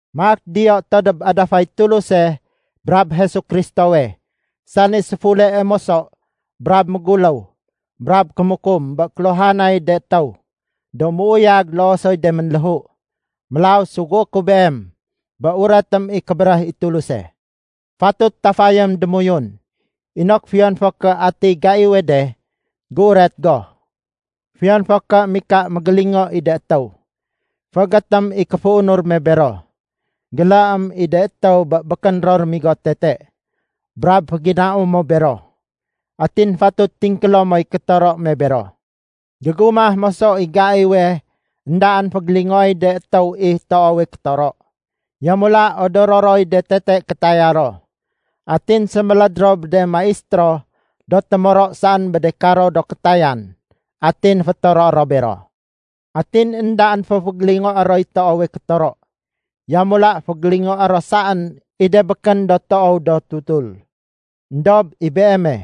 Maak diyo to dob adafay Tuluse brab Jesu Kristowe, sani séfulee moso brab méguléw brab kémukum bé kéluhanay de étéw, do méuyag loo soy do ménléhu. Mélaw sugué ku beem, bé uretém i kébéréh i Tuluse. Fatut tafayém démoyun inok fiyon fo ké ati gaiwe de, géuret go, fiyon fo ké mika mégélingo i de étéw. Féégétém i kéféunur me bero. Géléém i de étéw bé békén ro rémigo tete, brab féginau mo bero. Atin fatut tingkélo moy kétoro me bero. Gégumah moso i gaiwe éndaén fégélingoéy de étéw i toowe kétoro. Yamula odoro roy de tete kétaya ro. Atin séméléd ro bé de maistéro do témoro saén bé de karo do kétayan atin fétoro ro bero. Atin éndaén fo fégélingoé roy toowe kétoro. Yamula fégélingoé ro saén i de békén do toow do tutul. Endob i beeme,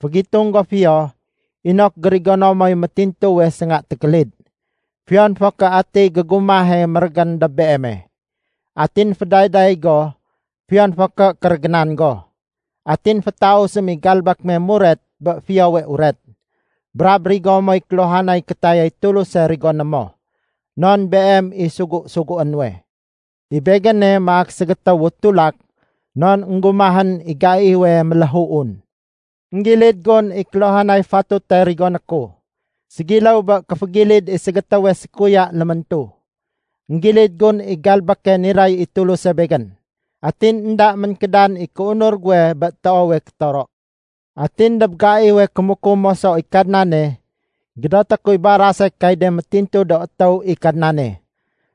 fégitung go fiyo inok gérigono moy métintuwe sénga tékélid, fiyon fo ké atiy gégumahe mérégén dob beeme. Atin fédayday go fiyon fo ké kérégénan go. Atin fétausém i galbék me muret bé Fiyowe Uret, brab rigo moy kéluhanay kétayay Tuluse rigoné mo non beem i sugu-sugué nuwe. I begéne maak ségétéwu tulak non énggumahén i gaiwe méléhuun. Enggilid gun i kéluhanay fatute rigoné ku, ségiléw bé kéfégilid i ségétéwe sékuya léméntu. Enggilid gun i galbéke niray i Tuluse begén. Atin énda ménkédan i kéunur guwe bé toowe kétoro. Atin dob gaiwe kémukum moso i Kadnane, gédoté kuy barase kay de métintu do étéw i Kadnane,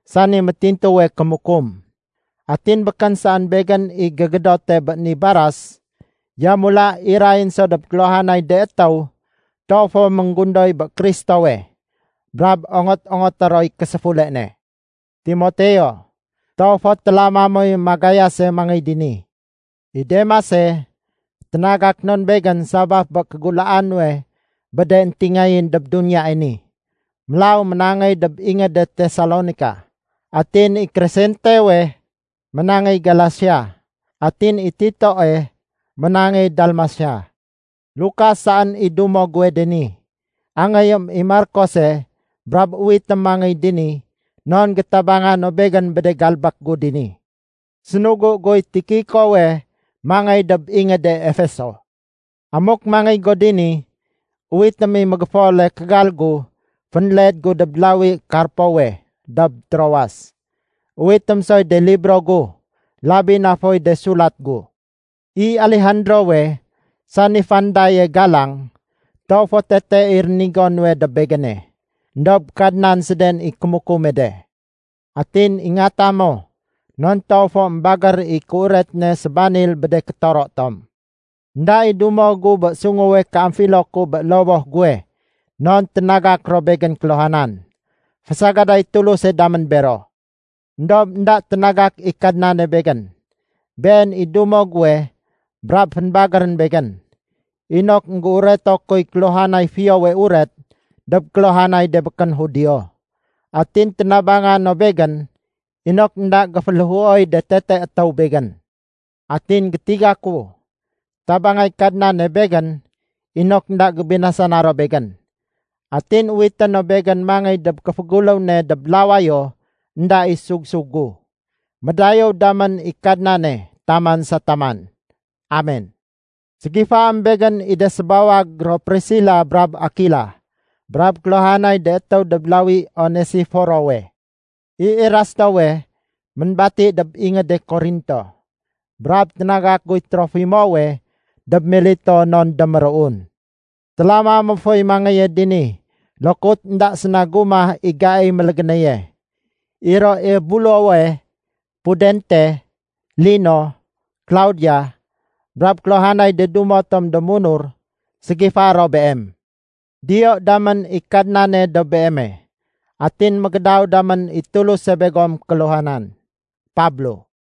sani métintuwe kémukum. Atin békén saén begén i gégédote bé ni baras, yamula irayén so dob kéluhanay de étéw toow fo ménggundoy bé Kristowe brab ongot-ongoté roy késéfule ne. Timoteo, toow fo télama moy magayase mangéy dini. I Demase, ténagak non begén sabaf bé kégulaa nuwe bé de éntingayén dob duniyae ni. Mélaw ménangéy dob ingéde Tesalonika. Atin i Kresentewe ménangéy Galasia, atin i Titoe ménangéy Dalmasia. Lukas saén i dumo guwe dini. Angéyém i Markose brab uwitém mangéy dini non gétabanga no begén bé de galbék gu dini. Sénugu guy Tikikowe mangéy dob ingéde Efeso. Amuk mangéy go dini, uwitém i mégéfole kégal gu fénled gu dob lawi Karpowe dob Troas. Uwitém soy de libro gu, labi na foy de sulat gu. I Alejandrowe, sani fandaye galang, toow fo tete i rénigo nuwe dob begéne. Endob Kadnan séden i kémukume de. Atin ingata mo non toow fo émbagér i kéuret ne sébanil bé de kétoro tom. Enda i dumo gu bé sunguwe kéamfilo ku bé lowoh guwe non ténagak ro begén kéluhanan. Fésagadéy Tuluse damén bero. Endob énda ténagak i Kadnane begén. Been i dumo guwe brab fénbagérén begén, inok énggéureto kuy kéluhanay Fiyowe Uret dob kéluhanay de békén Judio. Atin ténabanga no begén inok énda géféléhuoy de tete étéw begén. Atin gétiga ku, tabangay Kadnane begén inok énda gébinasana ro begén. Atin uwité no begén mangéy dob kéféguléw ne dob lawayo énda i sug-sug gu. Médayéw damén i Kadnane taman sa taman. Amen! Ségifaém begén i de sébawag ro Prisila brab Akila, brab kéluhanay de étéw dob lawi Onesiforowe. I Erastowe ménbati dob ingéde Korinto, brab ténagak guy Trofimowe dob Mileto non déméruun. Télama mo foy mangéye dini lokut énda séna gumah i gaiy mélégénéye. I ro Ebulowe, Pudente, Lino, Klaudia, brab kéluhanay de dumo tom do munur ségifaé ro beem. Diyo damén i Kadnane dob beeme. Atin mégédaw damén i Tuluse begom kéluhanan. Pablo